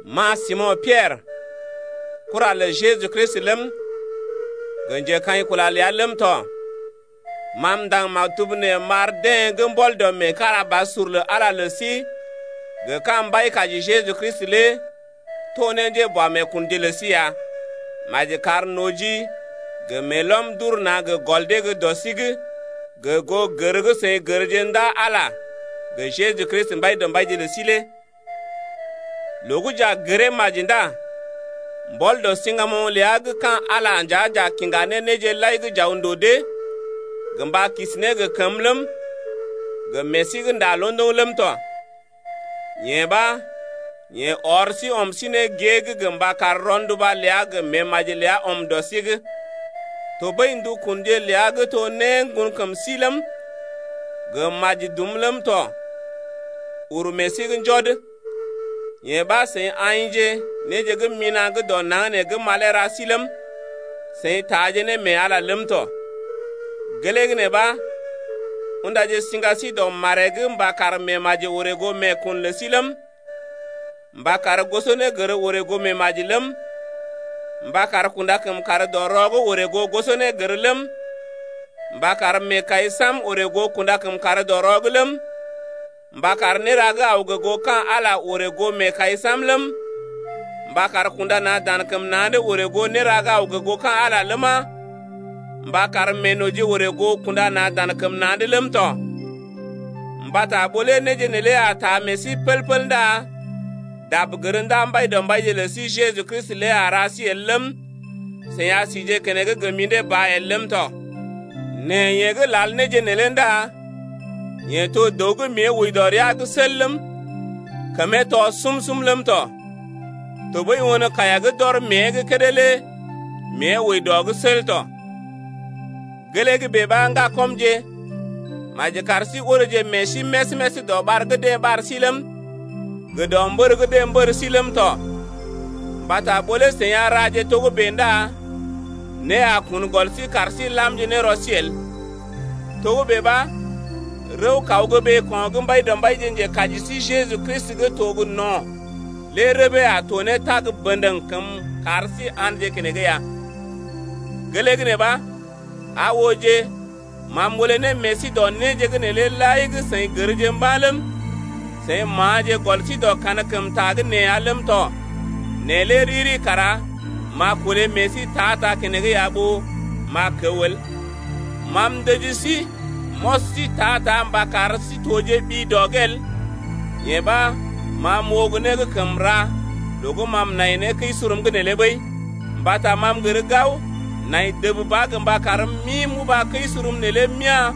Ma Simo̰ Piɛrə, kura lə Jeju Kristi ləm, gə njekaḭkula ləa ləm tɔ. Ma m’ndaŋg maktub nee m’ar deḛ gə́ mbɔl dɔ meekarabasur lə Ala lə sí gə ka̰ Mbaikaji Jeju Kristi lé to ne njéboameekunje lə sí ya. Maji kar noji gə meelɔm d’ur na̰ gə gɔl dee dɔ sí’g gə goo gər gə́ seḭ gərje ndaa Ala gə Jeju Kristi Mbaidɔmbaije lə sí lé. Loo gə́ j’a gəree maji ndá mbɔl dɔ siŋgamoŋ ləa gə́ ka̰ Ala lé nja j’a kiŋga ne néje lai gə́ j’aw ndòo dee gə mba kisi ne gə kəmə ləm, gə meḛ sí gə́ nda londoŋ ləm tɔ. Yee ɓa yeḛ ɔr sí ɔm sí ne gée’g gə mba kar rɔnduba ləa gə meemaji ləa ɔm dɔ sí’g. Tɔɓəi ndukunje ləa gə́ to né ŋgonkəm sí ləm, gə maji dum ləm tɔ uru meḛ sí’g njɔd, yee ɓa seḭ aḭje néje gə́ mina̰ gə́ dɔ naŋg gə́ malee ra sí ləm, seḭ taaje ne mee Ala ləm tɔ. Gelee gə́ nee ɓa undaje siŋga sí dɔ maree’g mba kar meemaji orè goo meekun lə sí ləm, mba kar gosonégər orè goo meemaji ləm, mba kar kunda kəmkàr-dɔ-rɔ’g orè goo gosonégər ləm, mba kar meekai sam-sam orè goo kunda-kəmkàr-dɔ-rɔ’g ləm, mba kar néra gə́ aw gə goo ka̰ Ala orè goo meekai sam-sam ləm, mba kar kunda na̰ dan kəm na̰’d orè goo néra gə́ aw gə goo ka̰ Ala ləma, mba kar meenoji orè goo kunda na̰ dan kəm na̰’d ləm tɔ. Mbata ɓó lé néje neelé a taa meḛ sí pəl-pəl ndá dab gər ndaa Mbaidɔmbaije lə sí Jeju Kristi lé a ra sí el ləm, seḭ a sije keneŋ gə mḭdé ba el ləm tɔ. Nɛ yeḛ gə́ lal néje neelé ndá yeḛ to dəw gə́ mée wəi dɔ rəa’g sel ləm, kəmee tɔ sum-sum ləm tɔ, tɔɓəi won kaiya gə́ d’ɔr mée’g kédé lé mée wəi dɔ’g sel tɔ. Gelee gə́ bèe ɓa ŋgakɔmje, maji kar sí oreeje meḛ sí més-més dɔ ɓar gə́ deḛ ɓar sí’g ləm, gə dɔ mbər gə́ deḛ mbər sí’g ləm tɔ, mbata ɓó lé seḭ a raje togə́bè ndá né a kun gɔl sí kar sí làmje ne rɔ sí el. Togə́bè ɓa, rəw-kaw gə́ ɓeeko̰ gə́ Mbaidɔmbaije Njekaji sí Jeju Kristi gə́ to gə no̰ lé rəbee a to ne tag bə̰dəŋ kəm kar sí a̰dje keneŋ ya. Gelee gə́ nee ɓa, aa ooje, ma m’olé ne meḛ sí dɔ néje’g neelé lai gə́ seḭ gərje mba̰ ləm, seḭ ma̰aje gɔl sí dɔ kankəmta gə́ nee ya ləm tɔ nɛ lé riri kara m’a kolé meḛ sí ta-ta keneŋ ya ɓó m’a kəw el. Ma m’ndəji sí m’ɔs sí ta-ta mba kar sí tojeɓi dɔ’g el, yee ɓa, ma m’oo gə́ né gə́ kəm ra loo gə́ ma m’nai mee kəi-surum’g neelé ɓəi. Mbata ma m’gər gao, nai dəb ba gə mba karm m’ḭ m’uba kəi-surum neelé m’ya̰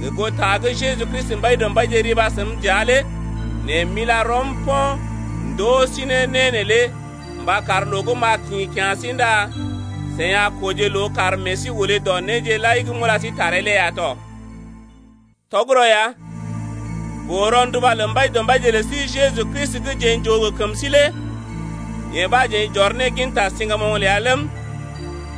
gə goo ta gə́ Jeju Kristi Mbaidɔmbaije riba səm dəa lé. Nɛ m’ila rɔm po̰ m’ndoo sí ne né neelé mba kar loo gə́ m’a kḭ kya̰ sí ndá seḭ a kooje loo kar meḛ sí olé dɔ néje lai gə́ m’ula sí taree lé ya tɔ. Tɔgərɔ ya, boo-rɔnduba lə Mbaidɔmbaije lə sí Jeju Kristi gə́ jeḛ j’oo gə kəm sí lé yee ɓa jeḛ j’ɔr ne ginta siŋgamoŋ ləa ləm,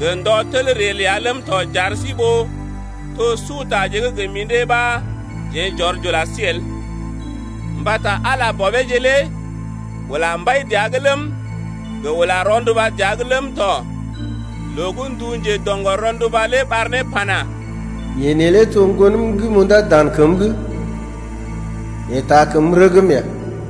gə ndɔ tel ree ləa ləm tɔ j’ar sí ɓó to sutaje gə́ gə mḭdé ɓa jeḛ j’ɔr j’ula sí el. Mbata Ala Bɔbeeje lé ula mbai dəa’g ləm, gə ula rɔnduba dəa’g ləm tɔ loo gə́ ndu njedo̰gɔr-rɔnduba lé ɓar ne pana: Yeḛ neelé to ŋgonəm gə́ m’undá dan kəm’g, yeḛ taa kəm rəgm ya.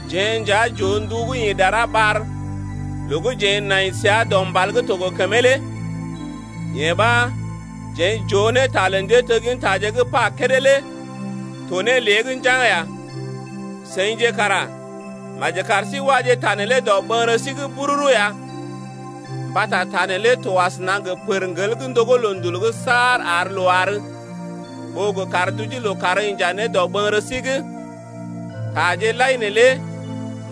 Jeḛ nja j’oo ndu gə́ ḭ dara ɓar loo gə́ jeḛ nai səa dɔ mbal gə́ to gə kəmee lé. Yee ɓa, jeḛ j’oo ne ta lə njéteggintaje gə́ pa kédé lé to ne lée’g njaŋg ya. Seḭje kara maji kar sí waje ta neelé dɔɓəŋgərə sí’g bururu ya mbata ta neelé to asəna gə pərŋgel gə́ ndogó loondul’g saar ar loo àr ɓó gə kar duje lookàr inja ne dɔɓəŋgərə sí’g. Taje lai neelé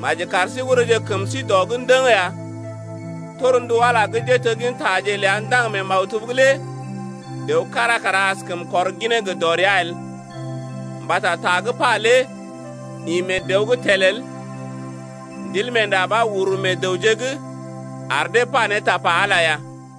maji kar ta gə́ neelé oreeje kəm sí dɔ’g ndəŋ ya, torndu Ala gə́ njéteggintaje ləa ndaŋg mee maktub’g lé dəw kára kara askəm kɔr ginee gə dɔrea el, mbata ta gə́ pa lé ḭ mee dəw’g tel el. Ndilmeenda ɓa uru meḛ dəwje’g ar dee pa ne tapa Ala lé ya.